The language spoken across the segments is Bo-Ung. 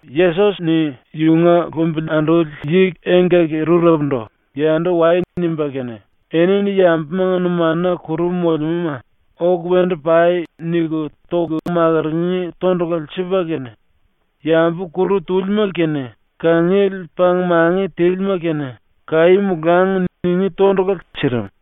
Yesos-ni yunga lumbili anduli yi engkaki-rurepundu “Yandu wai.” nimba kene enini yambumanga numanuna kuru molemúma “Oku wendu pai.” niku toku makurungí tondulale sipa kene, yambu kuru túlima kene kangiele pang-mangi tílima kene “Kaí molangi.” ningí tondulale sirim.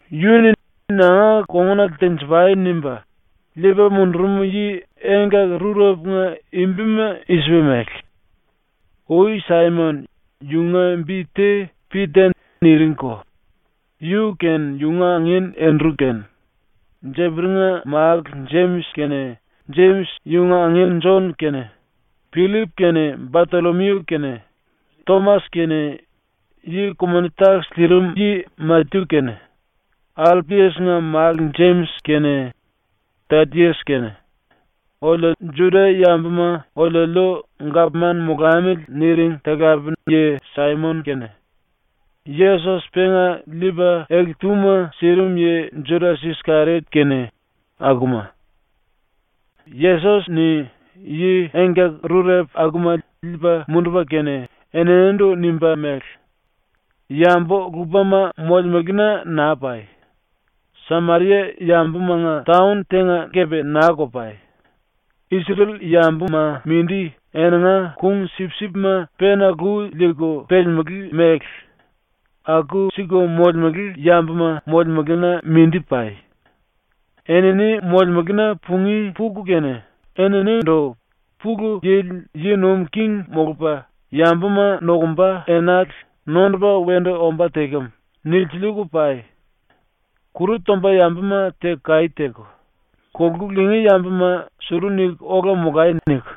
Yu-ni “Nanga kongunale tenji-pai.” nimba liipa mundurum yi engkaki-rurepunga bima i-sipa mele: Ui Saimon, yunga bi te ‘Pita’ niringko, yu kene yunga angin Endru kene, Jeperi-nga málu Jemis kene Jemis yunga angin Jon kene, Pillip kene Batollomiu kene, Tomas kene ku-moni-takis liirim yi Matyu kene, Alpias-nga málu Jemis kene Tadias kene, “Oliu Juda-yambuma oliuliu gapman molamili.” niring talape-yi Saimon kene, Yesos penga liipa ele-túma sirim yi Judas-Iskeriot kene, akuma. Yesos-ni yi engkaki-rurepu akuma liipa mundupa kene eninindu nimba mele: “Yambu-lupama molemelena naa pai. Sameria-yambumanga taon tenga kepe naa-ko pai. Isrel-yambuma mindi eninga kung-sipsipma pena lu liiku pelemelé mele aku-siku molemele yambuma molemelena mindi pai. Enini molemelena pungí puku kene, eninindu “Pulu Yili yi nuim king molupa yambuma nokumba enale nondupa wendu ombá tekem.” nilsiliiku pai. “Kuru tomba yambuma teku kaí teku, kolku lingí yambuma ‘Suru niku ola molai.’ niku,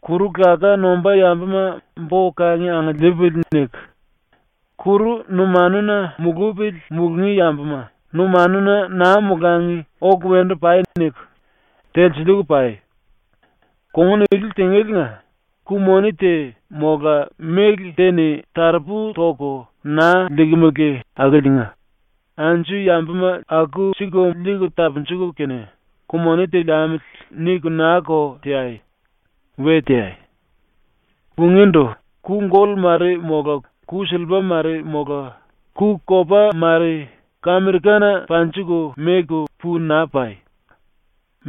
kuru laká nombá yambuma ‘Bo-kangi angiliipili.’ niku, kuru numanuna mulupili mulungí yambuma ‘Numanuna naa molangi, oku wendu pai.’ niku telsiliiku pai. Kongun ili tingéliinga tondulale ku-moni te mola méle te-ni taropu toku naa liikimele akiliinga anju yambuma aku-siku liiku tapunjuku kene, ‘Ku-moni te liamili.’ niku naa-ko teai. We teai. “Pungíndu ku-gollu mare mola ku-sillipa mare mola ku-kopa mare kamirikana panjiku meku pu naa pai.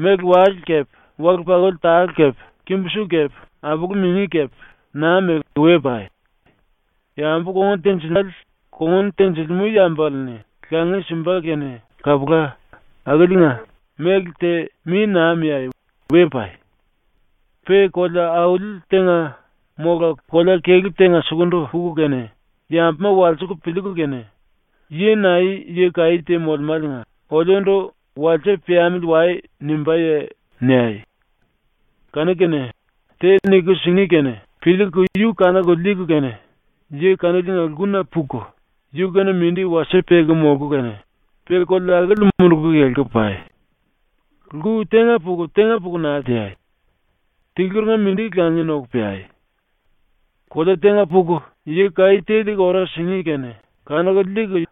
Méle-wale kepe wale-pakuli tale kepe kimbu-su kepe apulu-mingi kepe naa meku we pai. Yambu kongun tenjilimále kongun tenjilimú yambale-ni langi simba kene kapula, akiliinga méle te mi naa miai. We pai. “Pe kolea-auli tenga mola kolea-kelú tenga sukundu puku kene, yambuma walsiku piliiku kene “Yi nae yi kaí te molemáliinga oliundu “Wasie piamili wai.” nimbáye?” niai. Kanu-kene te niku singí kene piliiku yu kanuku liiku kene yi kaniliinga lkuna puku yu-kene mindi wasie peku molku kene pe kolea akili munduku kelku pai. ⸤Lku tenga puku tenga puku naa teai. Tiluringa mindi langi noku peai.⸥ ⸤Kolea tenga puku yi kaí te liiku ora singí kene kanuku liiku⸥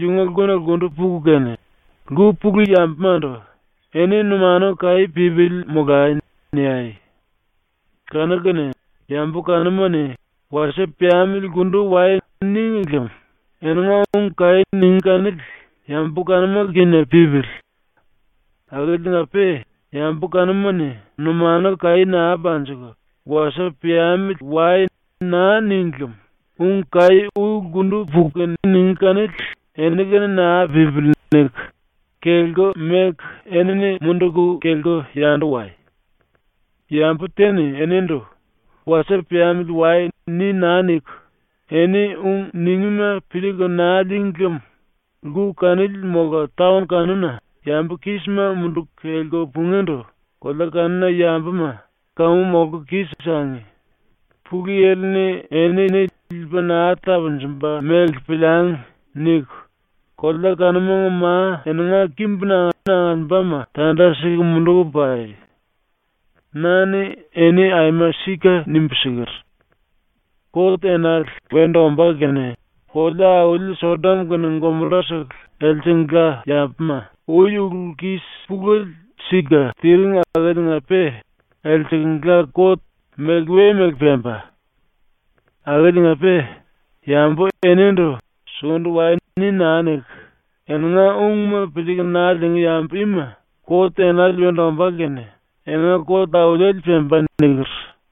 yunga lkuna lkundu puku kene, lku pulu yambumandu “Eni numanu kaí pípili molai.” niai. Kanu-kene yambu kanuma-ni “Wasie piamili lkundu wai.” níngi lem eninga ung kaí ningí kanili yambu kanuma-kene pípili. Akiliinga-pe yambu kanuma-ni numanu kaí naa panjiku, “Wasie piamili wai.” naa níngi lem ung kaí ui lkundu puku kene ningí kanili “Eni-kene naa pípili.” niku, kelku meku ⸤enini munduku kelku yandu wai⸥. “Yambu te-ni enindu “Wasie piamili wai.” ni naa niku eni ung ningíma piliiku naa lííngi lem lku kanili mola taon kanuna yambu kísima munduku kelku pungíndu ⸤kolea kanuna yambuma ‘Kamu molku kis-sangi. Pulu Yili-ni enini liipa naa tapunjumba mele piliangi.’ niku⸥ kolea kanumanga ma eninga kimbuna angiliimbama tanda siku munduku pai. Na-ni eni aima sika nimbu siker: “Kot enale wendu ombá kene kolea-auli Sodom kene Gomora-sele elsengla yambuma ⸤ui ulu-pulu-kis pulele sika tiring akiliinga-pe⸥ elsengla kot meliwe mele pemba. Akiliinga-pe yambu enindu “Sukundu wai.” ni naa niku eninga ungma piliiku naa liingí yambu ima kot enale wendu ombá kene eninga kot auliele pemba.” niker.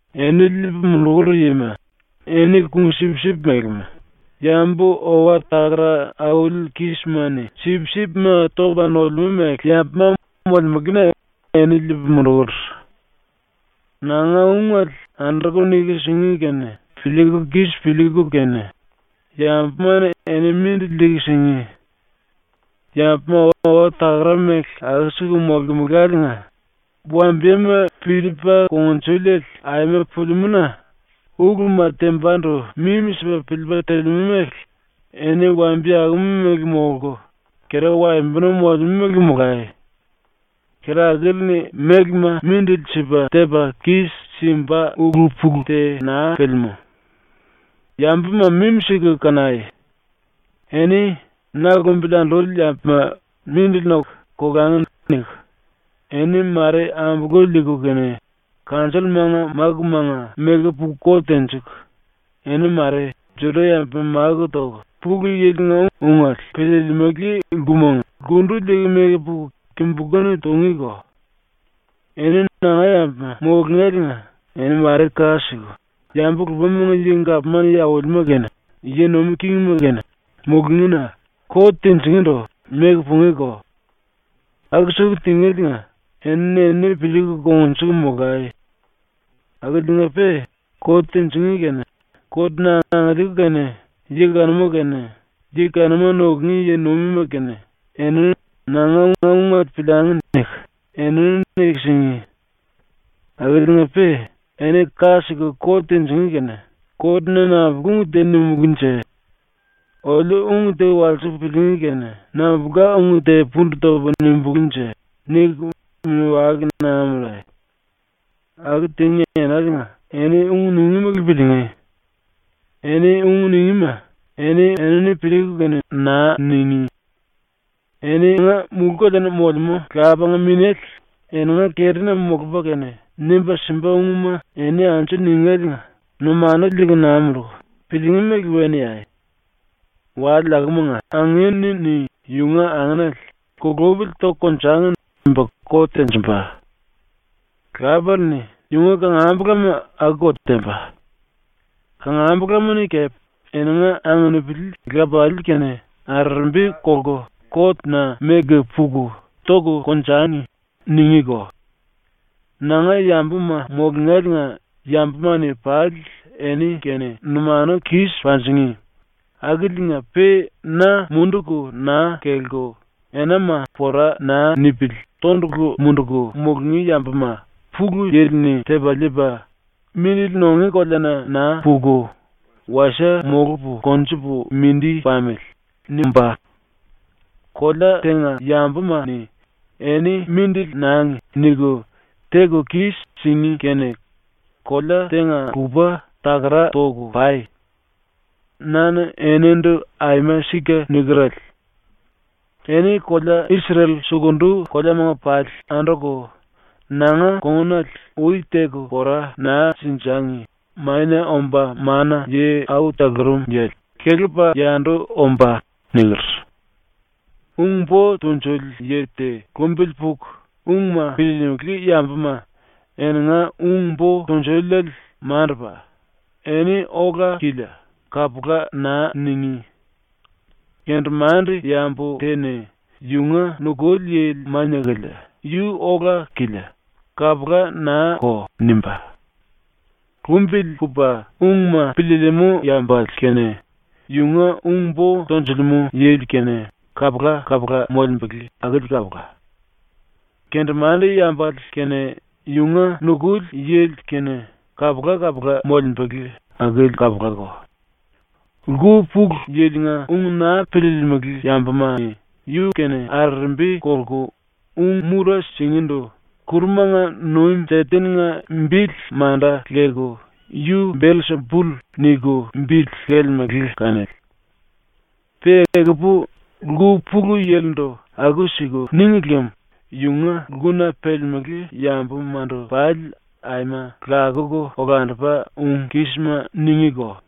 “Eni liipu mundukur yima eni kung-sipsip melema, yambu owa-takara auli kísima-ni sipsipma topa nolemú mele yambuma molemelena eni liipu mundukur. ⸤Nanga ungele anduku niku singí kene piliiku kis piliiku kene yambuma-ni eni mindili liiku singí.⸥ Yambuma owa-takara mele aku-siku molemeláliinga wambiyema piliipa kungnjuliele aima pelemú-na uluma tembandu mimi-sipa piliipa telemú mele eni wambiye akuma mele molku, kera-waembonu molemú mele molai. ⸤Kera akili-ni mélema mindili sipa tepa kis-simba ulu-pulu te naa pelemú.⸥ “Yambuma mimi-siku kanai. Eni ⸤‘Na lumbili anduli yambuma mindili noku, kolangi.’ niku,⸥ eni ⸤mare ambolku liiku kene⸥ kanjollumanga mákumanga meku puku kot tenjiku, eni ⸤mare⸥ Juda-yambuma máku toku Pulu Yili-nga ungele piliilimili lkumanga kundu liiku meku puku kimbulú-ni tungíko. Eni nanga yambuma mulungéliinga eni ⸤mare ka siku⸥ yambu-lupamanga gapman yi aulima kene yi nuim kingima kene mulungína ⸤kot tinjingíndu⸥ meku pungíko. Aku-siku tingéliinga eni-enini piliiku kongnjuku molai. Akiliinga-pe kot tinjingí kene kot-na angiliiku kene yi kanuma kene yi kanuma nukungí yi-nuimima kene eni ‘Nanga ungele piliangi.’ niku enini niku singí. Akiliinga-pe eni ka siku kot tinjingí kene ‘Kotna nambulka ung te nimulúnje? Oliu ung te walsiku piliingí kene nambulka ung te pundu topu nimulúnje?’ niku mini-wale naa mundai. Aku tingí enaliinga eni ung ningí mele piliingí. Eni ung ningíma eni-enini piliiku kene naa ningí. Eninga ⸤mulú-koleana molemú⸥ Lapanga Minéle eninga kerina molupa kene nimba simba ungma eni anju ningéliinga numanu liiku naa munduku, piliingí mele we niai. “⸤Wale akumanga⸥ angin-ni yunga anginele ‘Kulupili toku konjangi.’ nimba kot tenjimba. Lapale-ni yunga kangambulama akuko temba. Kangambulama-ni kepe eninga anupili lapalii-kene arerembi kolku kot-na meku puku “Toku konjangi.” ningíko. Nanga yambuma mulungéliinga yambuma-ni pali eni-kene numanu kis panjingí, akiliinga-pe na munduku naa kelku enama pora naa nipili tondulu munduku mulungí yambuma ⸤Pulu Yili-ni⸥ tepa liipa ‘Mindili nungí koleana naa puku, wasie molupu konjupu mindi pamili.’ nimbá. Kolea tenga yambuma-ni ‘eni mindili nangi.’ niku teku kis-singí kene kolea tenga-lupa takara toku pai. Na-ni enindu aima sika nikerele: “Eni kolea-Isrel sukundu koleamanga pali anduku nanga kongunale ui teku pora naa sinjangi Mania Omba Mana-Yi Au Talurum Yili ⸤kelepa yandu⸥ ombá.” niker. “Ung-bo tunjuli yi te lumbili puku ungma piliilimili yambuma ‘Eninga ung-bo tunjuliele mandupa, eni ola-kilia.’ kapula naa ningí. Kendemande-yambu te-ni ‘yunga nukuli yili mania-kilia, yu ola-kilia.’ kapula naa-ko nimbá. Lumbili pupa ungma piliilimú yambale kene yunga ung-bo tonjulemú yili kene kapula-kapula molembele akili kapula. Kendemande-yambale kene yunga nukuli yili kene kapula-kapula molembele akili kapulako. Lku pulu yilinga ung naa piliilimili yambuma-ni yu-kene arerembi kolku ung-mura singíndu ⸤kurumanga nuim Seten-nga bili manda leku⸥ “Yu Belsipull” niku bili lelemele kanili. Pe ekupu lku pulu yilindu aku-siku níngi lem yunga lkuna pelemelé yambumandu pali aima lakuku olandupa ung kísima ningíko.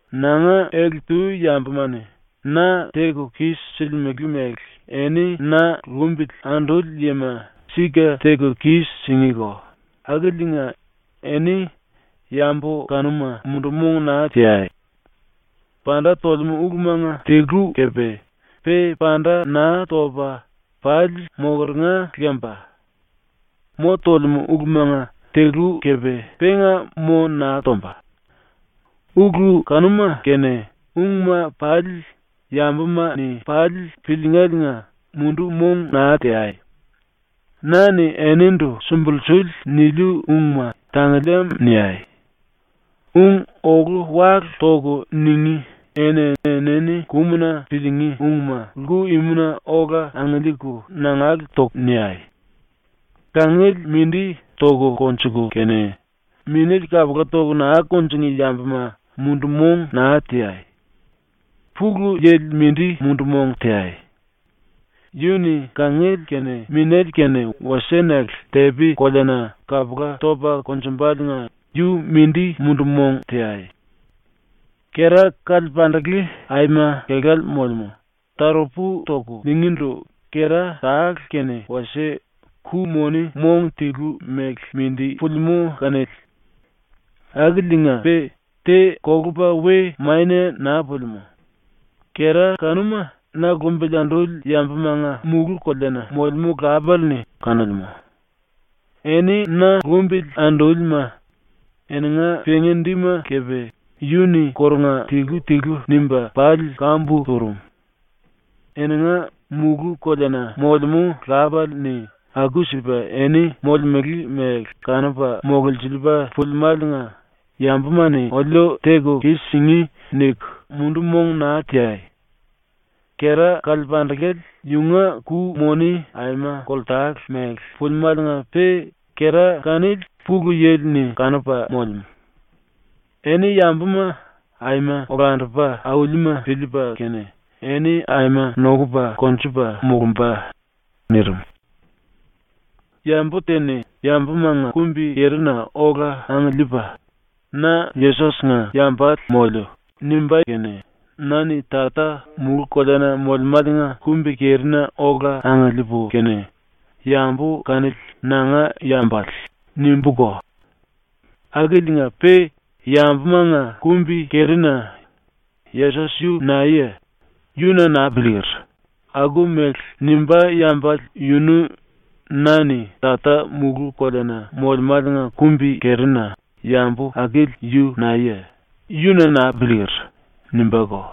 “⸤Nanga ele-tu yambuma-ni na teku kis-silimele mele eni na lumbili anduli yima sika teku kis-singíko⸥ akiliinga eni yambu kanuma mundu-mong naa teai. Panda tolemú ulumanga tilu kepe pe panda naa topa pali mokeringa lemba. Mo tolemú ulumanga tilu kepe penga mo naa tomba. Ulu kanuma kene ungma pali yambuma-ni pali piliingéliinga mundu-mong naa teai. Na-ni enindu sumbulsuli niliu ungma tangiliim niai. Ung ólu-wálu toku ningí eni-enini kumuna piliingí ungma lku-imuna ola angiliiku nangale toku niai. “Kangiele mindi toku konjuku kene minéle kapula toku naa kunjingí yambuma mundu-mong naa teai. ⸤Pulu Yili mindi mundu-mong teai⸥. Yu-ni kangiele kene minéle kene wasie-nele tepi-koleana kapula topa konjumbaliinga yu-mindi mundu-mong teai. “Kera-kalepandele aima kelále molemú, taropu toku liingíndu kera tale kene wasie ku-moni mong tilu mele mindi pulimú kanili. Akiliinga-pe te kolupa we mania naa pulimú. Kera kanuma na lumbili anduli yambumanga ⸤mulú-koleana molemú⸥ Lapale-ni kanolemú. Eni ⸤na lumbili andúlima⸥, eninga pengi-dima kepe yu-ni kórunga tilu-tilu nimba pali kambu turum. Eninga ⸤mulú-koleana molemú⸥ Lapale-ni aku-sipa eni molemele mele kanupa mololsiliipa pulimáliinga ⸤‘Yambuma-ni oliu teku kis-singí.’ niku⸥ mundu-mong naa teai. Kera-kalepandele yunga ku-moni aima koltale mele pulimáliinga-pe kera kanili Pulu Yili-ni kanupa molemú. Eni yambuma aima olandupa aulima piliipa kene eni aima nokupa konjupa molumba.” ⸤nirim.⸥ “Yambu te-ni yambumanga kumbi-kerina ola angiliipa “Na Yesos-nga yambale moliu.” nimbá kene na-ni Tata mulú-koleana molemáliinga kumbi-kerina ola angiliipu kene “Yambu kanili nanga yambale.” nimbúko. Akiliinga-pe yambumanga kumbi-kerina “Yesos yu naeye? Yu na naa piliiker.” aku-mele nimbá yambale yunu na-ni Tata mulú-koleana molemáliinga kumbi-kerina “Yambu akili yu naeye? Yu na naa piliiker.” nimbúko.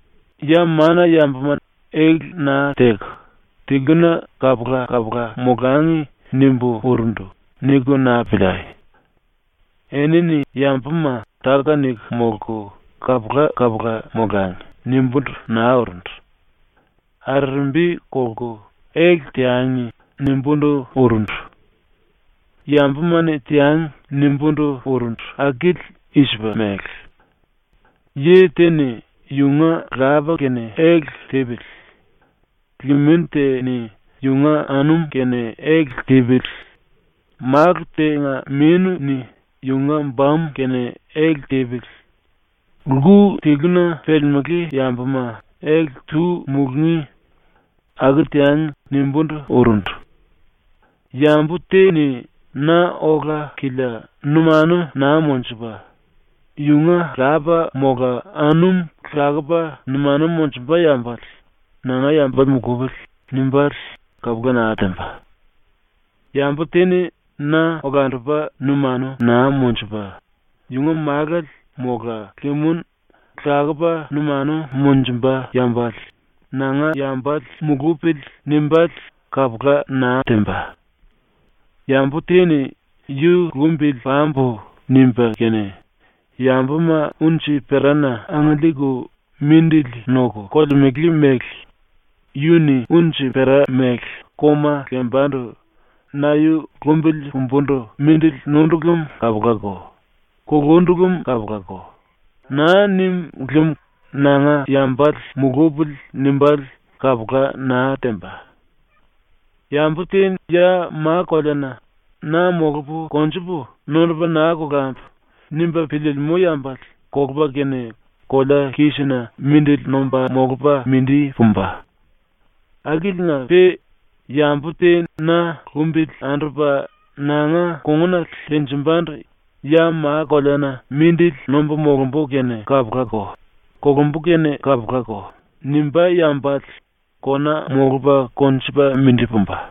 “‘ ‘Ya mana-yambuma ele naa teku tiluna kapula-kapula molangi.’ nimbu urundu.’ niku naa piliai. Enini yambuma ‘Táka-niku molku kapula-kapula molangi.’ nimbúndu naa urundu. ‘Arerembi kolku ele teangi.’ nimbúndu urundu. ‘Yambuma-ni teangi.’ nimbúndu urundu akili i-sipa mele: “Yi te-ni yunga lapa kene ele tipili, limin te-ni yunga anum kene ele tipili, málu tenga mínu-ni yunga bamu kene ele tipili. Lku tiluna pelemelé yambuma ele-tu mulungí.” ‘Aku teangi.’ nimbúndu urundu. “Yambu te-ni na ola-kilia numanu naa monjupa, yunga lapa mola anum lakupa numanu monjumba yambale ‘Nanga yambale mulupili.’ nimbále kapula naa temba. Yambu te-ni na olandupa numanu naa monjupa, yunga málale mola limin lakupa numanu monjumba yambale ‘Nanga yambale mulupili.’ nimbále kapula naa temba. Yambu te-ni ‘Yu lumbili pambu.’ nimba kene yambuma unji-perana angiliiku mindili noku kolemele mele yu-ni unji-pera mele koma lembandu ‘Na yu lumbili pumbundu mindili nundu lem kapulako; kulundu lem kapulako.’ naa nim lem ‘Nanga yambale mulupili.’ nimbále kapula naa temba. Yambu te ya ma-koleana ‘Na molupu konjupu, nondupa naa kolambu.’ nimba piliilimú yambale kolupa kene kolea kísina mindili nomba molupa mindi pumba. Akiliinga-pe yambu te na lumbili andupa nanga kongunale tenjimbandu ‘Ya ma-koleana mindili nombu molumbu kene kapulako, kolumbu kene kapulako.’ nimbá yambale kona molupa konjupa mindi pumba.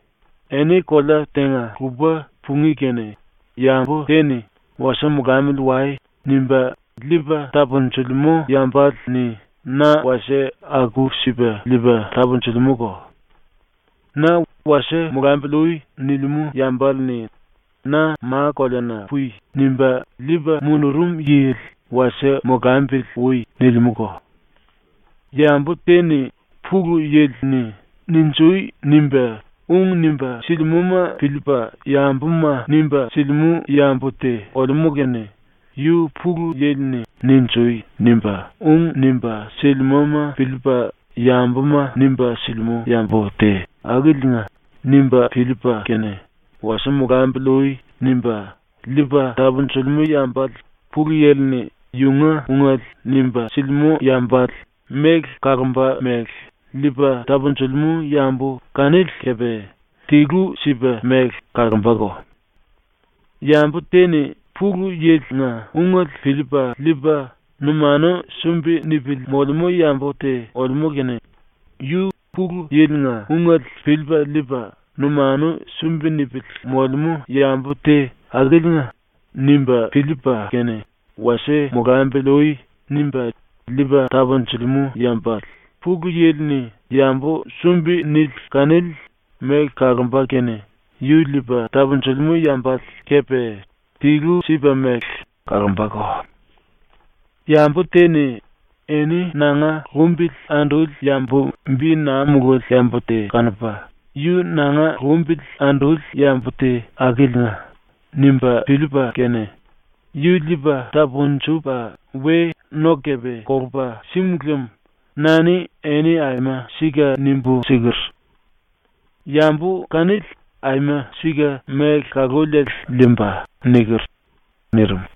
“Eni kolea tenga-lupa pungí kene yambu te-ni ‘Wasie molamili wai.’ nimba liipa tapunjilimú yambale-ni na wasie aku-sipa liipa tapunjilimúko. Na ‘Wasie molambili ui.’ nilimú yambale-ni na “Ma-koleana pui.” nimba liipa mundurum yili ‘Wasie molambili ui.’ nilimúko. Yambu te-ni Pulu Yili-ni “Ninjui!” nimba ung nimba silimúma piliipa yambuma nimba silimú yambu te olemú kene ‘Yu Pulu Yili-ni “Ninjui!” nimba ung nimba silimúma piliipa yambuma nimba silimú yambu te akiliinga’ nimba piliipa kene “Wasie molambili ui.” nimba liipa tapunjilimú yambale Pulu Yili-ni yunga ungele nimba silimú yambale méle kalomba mele liipa tapunjilimú yambu kanili kepe tilu-sipa-mele kalombako. Yambu te-ni Pulu Yili-nga ungele piliipa liipa numanu sumbi nipili molemú yambu te olemú kene ‘Yu Pulu Yili-nga ungele piliipa liipa numanu sumbi nipili molemú yambu te akiliinga.’ nimba piliipa kene ‘Wasie molambili ui.’ nimba liipa tapunjilimú yambale ⸤Pulu Yili-ni⸥ yambu sumbi-nili kanili méle kalomba kene yu liipa tapunjilimú yambale kepe tilu-sipa-mele kalombako. Yambu te-ni eni nanga lumbili anduli yambu bi naa mululi yambu te kanupa ‘yu nanga lumbili anduli yambu te akiliinga’ nimba piliipa kene yu liipa tapunjupa we no kepe kolupa símu lem na-ni eni aima sika nimbu siker: “Yambu kanili aima sika méle kaluliele liimba.” niker.” nirim.